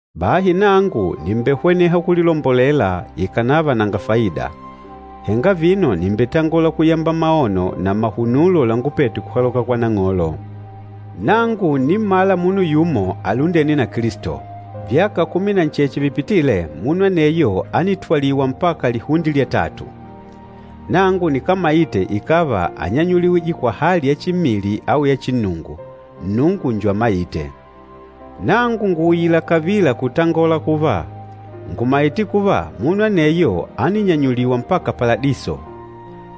Bahi nangu nìmbehweneha kulilombolela ikànava nanga faida. Henga vino nìmbetangola kuyamba maono na mahunulo langupete kuhaloka kwa Nang'olo. Nangu ǹnimmala munu yumo alundêne na Kilisto. Vyaka kumi na ncheche vipitîle, munu aneyo ánitwaliwa mpaka lihunde lya tatu. Nangu nikámaite ikàva ányanyuliwije kwa hali ya chimmili au ya chinnungu, Nnungu njo amaîte. Nangu ngùuyila kavila kutangola kuva, ngùmaite kuva, munu aneyo áninyanyuliwa mpaka Paladiso.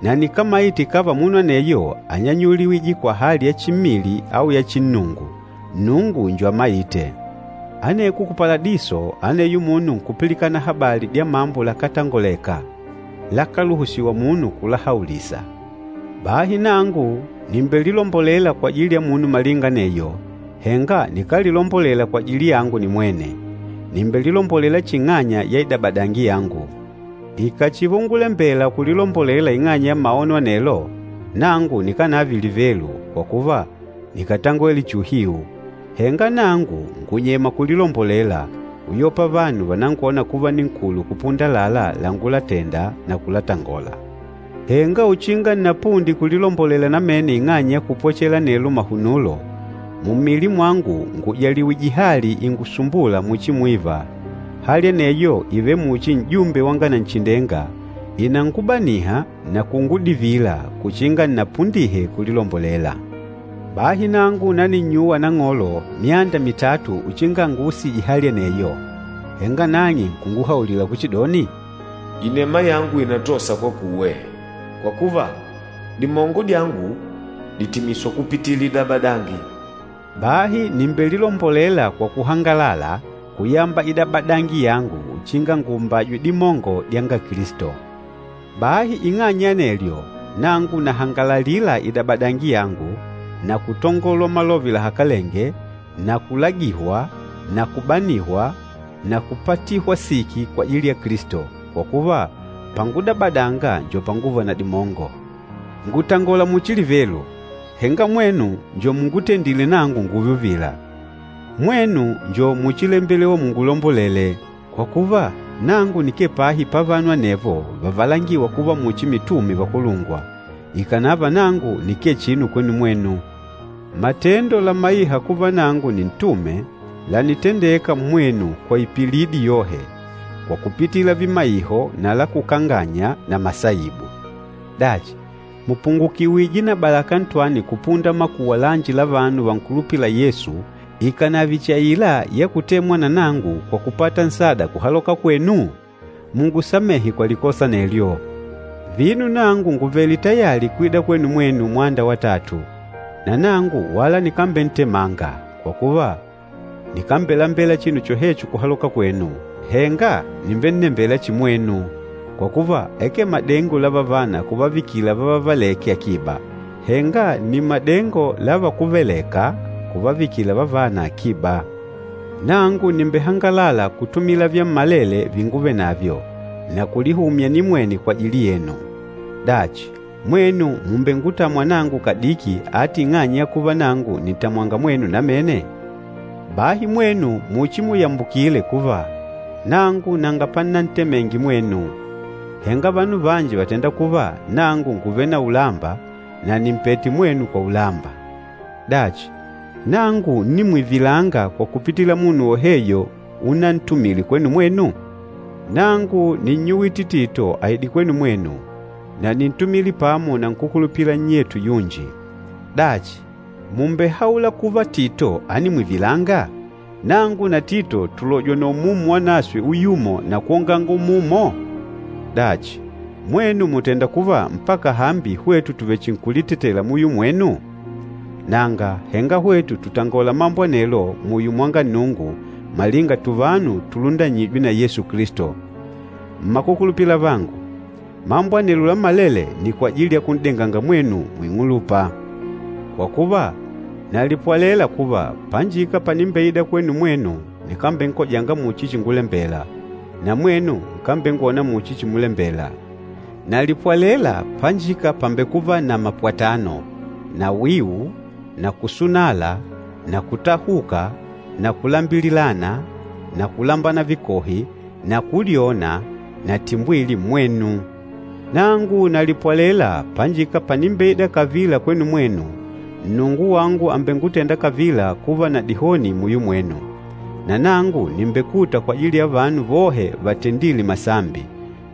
Na nikámaite ikàva munu aneyo ányanyuliwije kwa hali ya chimmili au ya chinnungu, Nnungu njo amaîte. Aneko ku Paladiso, aneyo munu nkupilikana habali dya mambo lakátangoleka, lakáluhusiwa munu kulahaulisa. Bahi nangu nìmbelilombolela kwajili ya munu malinga aneyo, henga nikámbelilombolela kwajili yangu nimwene. Nìmbelilombolela chihi ing'anya ya idabadangi yangu. Ikàchiva ungulembela kulilombolela ing'anya ya maono anelo, nangu nikánave livelu, kwa kuva, nikàtangwele chihi uhiu. Henga nangu ngùnyema kulilombolela, uyopa vanu vànangwona kuva ninkulu kupunda àlalá langulatenda na kulatangola. Henga uchinga nnapunde kulilombolela namene ing'anya ya kupwechela anelo mahunulo, mummili mwangu ngùjaliwije hali ingusumbûla muchi mwiva. Hali aneyo ìvele muchi n'jumbe wanga Nanchindenga, ìnangubaniha na kungudivila kuchinga nnapundihe kulilombolela. Bahi nangu naninnyuwa Nang'olo myanda mitatu uchinga anguusije hali aneyo. Henga nang'e nkunguhaulila kuchidoni, “Inema yangu ìnatosa kwakuwe, kwa kuva dimongo dyangu dìtimiswa kupitila idabadangi.” Bahi nìmbelilombolela kwa kuhangalala kuyamba idabadangi yangu uchinga nguumbajwe dimongo dyanga Kilisto. Bahi ing'anya ya anelyo, nangu nahangalalila idabadangi yangu, na kutongolwa malove lahakalenge, na kulagihwa na kubanihwa na kupatihwa siki kwajili ya Kilisto, kwa kuva pangudabadanga njo panguva na dimongo. Ngùtangola muchi livelu, henga mwenu njo mungutendîle nangu ngùùve uvila. Mwenu njo muchilembelewa mungulombolele. Kwa kuva, nangu nikee pahi pavanu anevo vavalangîwa kuva muchi mitume vakulungwa, ikànava nangu nikee chinu kwenu mwenu. Matendo lamaîha kuva nangu nintume, lànitendeka mmwenu kwa ipilidi yohe, kwa kupitila vimaiho na lakukanganya na masaibu. Dachi, mùpungukiwije na balaka ntwani kupunda makuwa lanji la vanu vankulupîla Yesu ikànave chihi aila ya kutemwa na nangu kwa kupata nsada kuhaloka kwenu? Mungusamehe kwa likosa anelyo. Vino nangu ngùvele tayali kwida kwenu mwenu mwanda watatu, na nangu wala nikambentemanga. Kwa kuva, nikambelambela chinu chohecho kuhaloka kwenu, henga nìmbennembela chihi mwenu. Kwa kuva, akee madengo la vavana kuvavikila vavavelêke akiba, henga nni madengo la vakuvelêka kuvavikila vavana akiba. Nangu nìmbehangalala kutumila vyammalele vinguvenavyo, na kulihumya nimwene kwajili yenu. Dachi, mwenu mùmbengutamwa nangu kadiki ati ing'anya ya kuva nangu nìntamwanga mwenu namene? Bahi mwenu muchimuyambukile kuva, nangu nanga pannantemenge mwenu. Henga vanu vanji vàtenda kuva nangu ngùvele na ulamba na nìmpete mwenu kwa ulamba. Dachi, nangu ńnimwivilanga kwa kupitila munu woheyo unantumile kwenu mwenu? Nangu nínnyuwite Tito aide kwenu mwenu, na níntumile pamo na nkúkulupila nnyetu yunji. Dachi, mùmbehaula kuva Tito ánimwivilanga? Nangu na Tito tùlojwa na Umumu Wanaswe uyumo na kwonganga umumo? Dachi, mwenu mùtenda kuva mpaka hambi hwetu tùvechinkulitetela muyo mwenu? Nanga, henga hwetu tùtangola mambo anelo muyo mwanga Nnungu malinga tuvanu tulundanywîje na Yesu Kilisto. Mmakukulupila avangu, mambo anelo lammalele nni kwajili ya kun'denganga mwenu muing'ulupa. Kwa kuva, nalipwalela kuva, panjika panimbeida kwenu mwenu nikambenkojanga muchi chingulembela, na mwenu nkambengwona muchi chimulembela. Nalipwalela panjika pàmbekuva na mapwatano, na wiu na kusunala na kutahuka na kulambililana na kulambana vikohi na kulyona na timbwili, mmwenu. Nangu nalipwalela panjika panimbeida kavila kwenu mwenu, Nnungu wangu àmbengutenda kavila kuva na dihoni muyo mwenu. Na nangu nìmbekuta kwajili ya vanu vohe vatendîle masambi,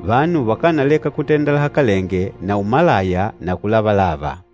vanu vakánaleka kutenda lahakalenge na umalaya na kulavalava.